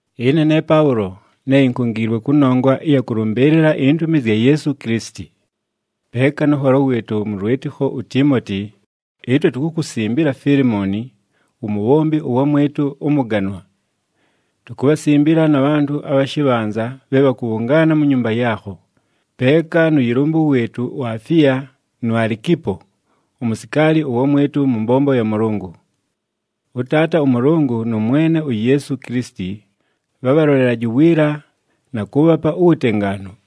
Ɨne ne Paʉlo, ne inkungiilwe kʉnongwa ɨya kʉlʉmbɨɨlɨla intumi zya Yeesu Kilisiti. Peeka nʉ nholo wɨɨtʉ mʉ lwɨtɨkho uTiimoti, ɨtwe tukukusimbila Fiilimooni, wumubhombi ʉwamwɨtʉ ʉmʉganwa. Tukubhasimbila na bhantʉ abha shɨbhanza bhe bhakʉbhʉngaana mu nyumba yaakho, peeka nʉ yɨlʉmbʉ wɨɨtʉ uAfiya, nu Alikipo, umusikaali ʉwamwɨtʉ mʉ mbombo ya Mʉlʉngʉ. ɄTaata ʉMʉlʉngʉ nʉ Mwene uYeesu Kilisiti bhabhalolelaje uwiila, na kʉʉbhapa uwutengaanu.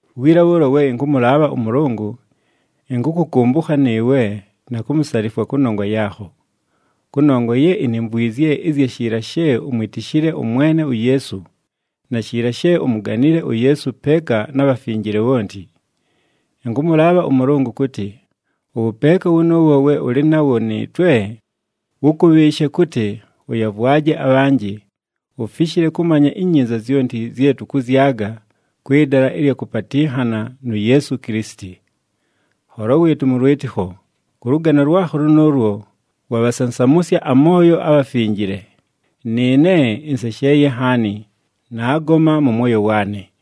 Wiila bhʉʉlo we ɨnkʉmʉlaabha ʉMʉlʉngʉ, ɨnkʉkʉkʉmbʉkha nɨɨwe na kumusalifwa kʉnongwa yaakho. Kʉnongwa ye inimvwizye ɨzya shiila she umwitishile ʉMwene uYeesu, na shiila she umuganile uYeesu peeka na bhafinjile bhonti. Ɨnkʉmʉlaabha ʉMʉlʉngʉ kʉtɨ, ʉwʉpeeka wʉnʉʉwo we ʉlɨ nawo nɨɨtwe wʉkʉbhɨɨshe kʉtɨ, ʉyavwaje abhanjɨ, ufishile kʉmanya inyinza zyonti zye tʉkʉzyaga kwɨ dala ɨlya kʉpatɨnhana nu Yeesu Kilisiti. Nholo wɨɨtʉ mʉ lwɨtɨkho, kʉ lʉgano lwakho lʉnʉʉlwo, wabhasansamʉsya amooyo abhafinjile, nɨɨne ɨnsesheeye nhaani, naagoma mʉ mwoyo waanɨ.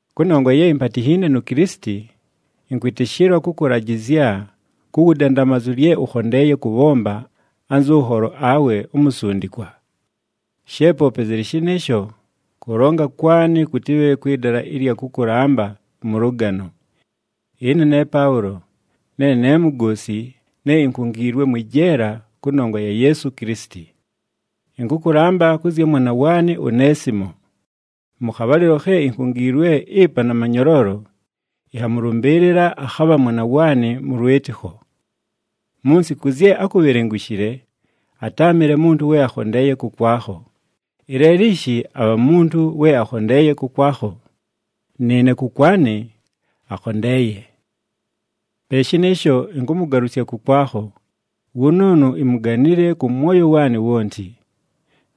Kʉnongwa ye impatinhiine nu Kilisiti, ɨnkwɨtɨshɨlwa kʉkʉlajɨzya ku wudandamazu lye ʉkhondeeye kʉbhomba anzʉ nholo awe umusundikwa. She poope zɨlɨ shɨnɨɨsho, kʉlonga kwanɨ kʉtɨbhe kwɨ dala ɨlya kʉkʉlamba mʉ lʉgano. Ɨne ne Paʉlo, ne ne mugoosi ne inkungiilwe mwɨ jeela kʉnongwa ya Yeesu Kilisiti. Ɨnkʉkʉlamba kʉ zya mwana waanɨ uNeesimo. Mʉ khabhalɨlo khe inkungiilwe ɨpa na manyoloolo, ɨnhamʉlʉmbɨɨlɨla, akhabha mwana waanɨ mʉ lwɨtɨkho. Mu nsiku zye ákubhelengushile atáamɨle muntu we akhondeeye kʉkwakho, ɨleelo ishi abha muntu we akhondeeye kʉkwakho, nɨɨne kʉkwanɨ akhondeeye. Pe shɨnɨɨsho, ɨnkʉmʉgalʉsya kʉkwakho, wʉnʉʉnʉ imuganile kʉ mwoyo waanɨ wonti.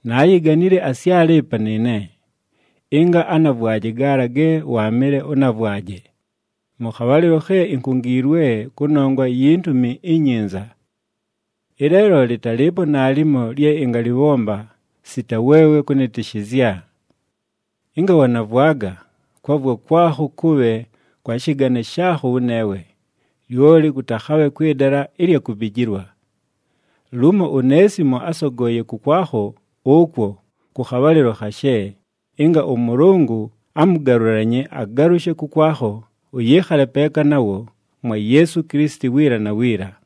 Naayiganile asyale ɨpa nɨɨne, ɨnga anavwaje gaala ge waamɨle ʉnavwaje, mʉ khabhalɨlo khe inkungiilwe kʉnongwa yi Ntumi iNyinza. Ɨleelo lɨtalɨɨpo naalimo lye ɨngalɨbhomba sita weewe kʉnɨtɨshɨzya. Ɨnga wanavwaga, kwavwa kwakho kʉbhe kwa shɨgane shaakho wʉneewe, lyoli kʉtakhabhe kwɨ dala ɨlya kubijilwa. Lumo uNeesimo ásogooye kʉkwakho ʉkwo kʉ khabhalɨlo khashe, ɨnga ʉMʉlʉngʉ amʉgalʉlanye agalʉshe kʉkwakho ʉyɨɨkhale peeka nawo mwa Yeesu Kilisiti wiila na wiila.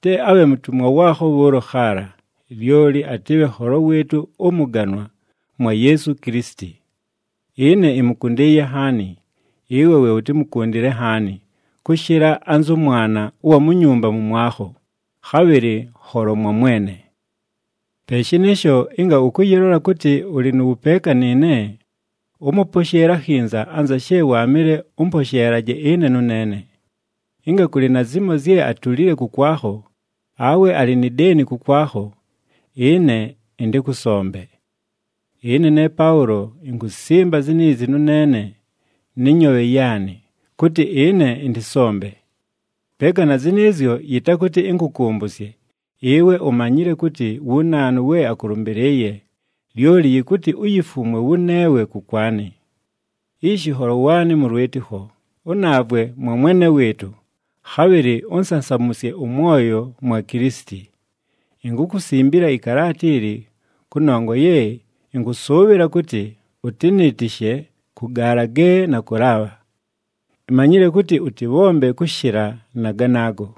Te abhe mutumwa waakho bhʉʉlo khaala, lyoli atɨbhe nholo wɨɨtʉ ʉmʉganwa mwa Yeesu Kilisiti. Ɨne ɨmʉkʉndɨɨye nhaani, ɨwe we ʉtɨmʉkʉndɨle nhaani kʉshɨla anzʉ mwana ʉwa mu nyumba mʉmwakho, khabhɨlɨ nholo mwa Mwene. Pe shɨnɨɨsho, ɨnga ʉkʉyɨlola kʉtɨ ʉlɨ nʉ wʉpeeka nɨɨne, ʉmʉposheele akhinza anza she waamɨle ʉmposheelaje ɨne nʉneene. Ɨnga kʉlɨ na zimo zye atulile kʉkwakho, awe alɨ ni deeni kʉkwakho, ɨne ɨntɨkʉsombe. Ɨne ne Paʉlo inkusimba ziniizi nʉneene nɨ nyoobhe yaanɨ, kʉtɨ ɨne ɨntɨsombe. Peeka na zɨnɨɨzyo, yɨtakʉtɨ ɨnkʉkʉmbʉsye, ɨwe umanyile kʉtɨ wu naanu we akʉlʉmbɨlɨɨye, lyoli yɨkʉtɨ uyifumwe wʉneewe kʉkwanɨ. Ishi nholo waanɨ mʉ lwɨtɨkho, ʉnaavwe mwa Mwene wɨɨtʉ, khabhɨlɨ ʉnsansamʉsye ʉmwoyo mwa Kilisiti. Inkukusimbila ɨkalaata ili, kʉnongwa ye ɨnkʉsʉʉbhɨla kʉtɨ ʉtɨnɨɨtɨshe kʉ gaala ge nakʉlaabha. Imanyile kʉtɨ, ʉtɨbhombe kʉshɨla na ganaago.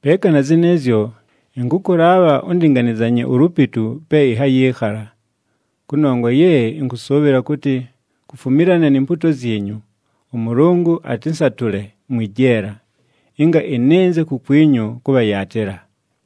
Peeka na zɨnɨɨzyo, ɨnkʉkʉlaabha ʉndɨnganɨzanye ulupitu pe ɨnhayɨɨkhala. Kʉnongwa ye ɨnkʉsʉʉbhɨla kʉtɨ, kufumilana ni mpuuto zyinyu, ʉMʉlʉngʉ atɨnsatʉle mwɨ jeela, ɨnga ɨnɨnze kukwinyu kʉbhayaatɨla.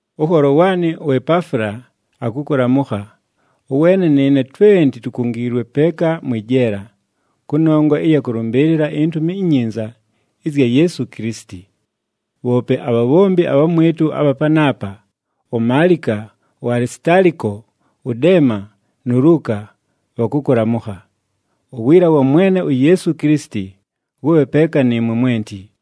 Ʉnholo waanɨ uEpaafula akʉkʉlamʉkha, ʉweene nɨɨne twenti tukungiilwe peeka mwɨ jeela, kʉnongwa ɨya kʉlʉmbɨɨlɨla iNtumi iNyinza ɨzya Yeesu Kilisiti. Bhoope abhabhombi abhamwɨtʉ abha panaapa, uMaalika, uAlisitaaliko, ʉDeema, nu Luuka bhakʉkʉlamʉkha. Uwiila wa Mwene uYeesu Kilisiti wʉbhe peeka nɨɨmwe mwenti.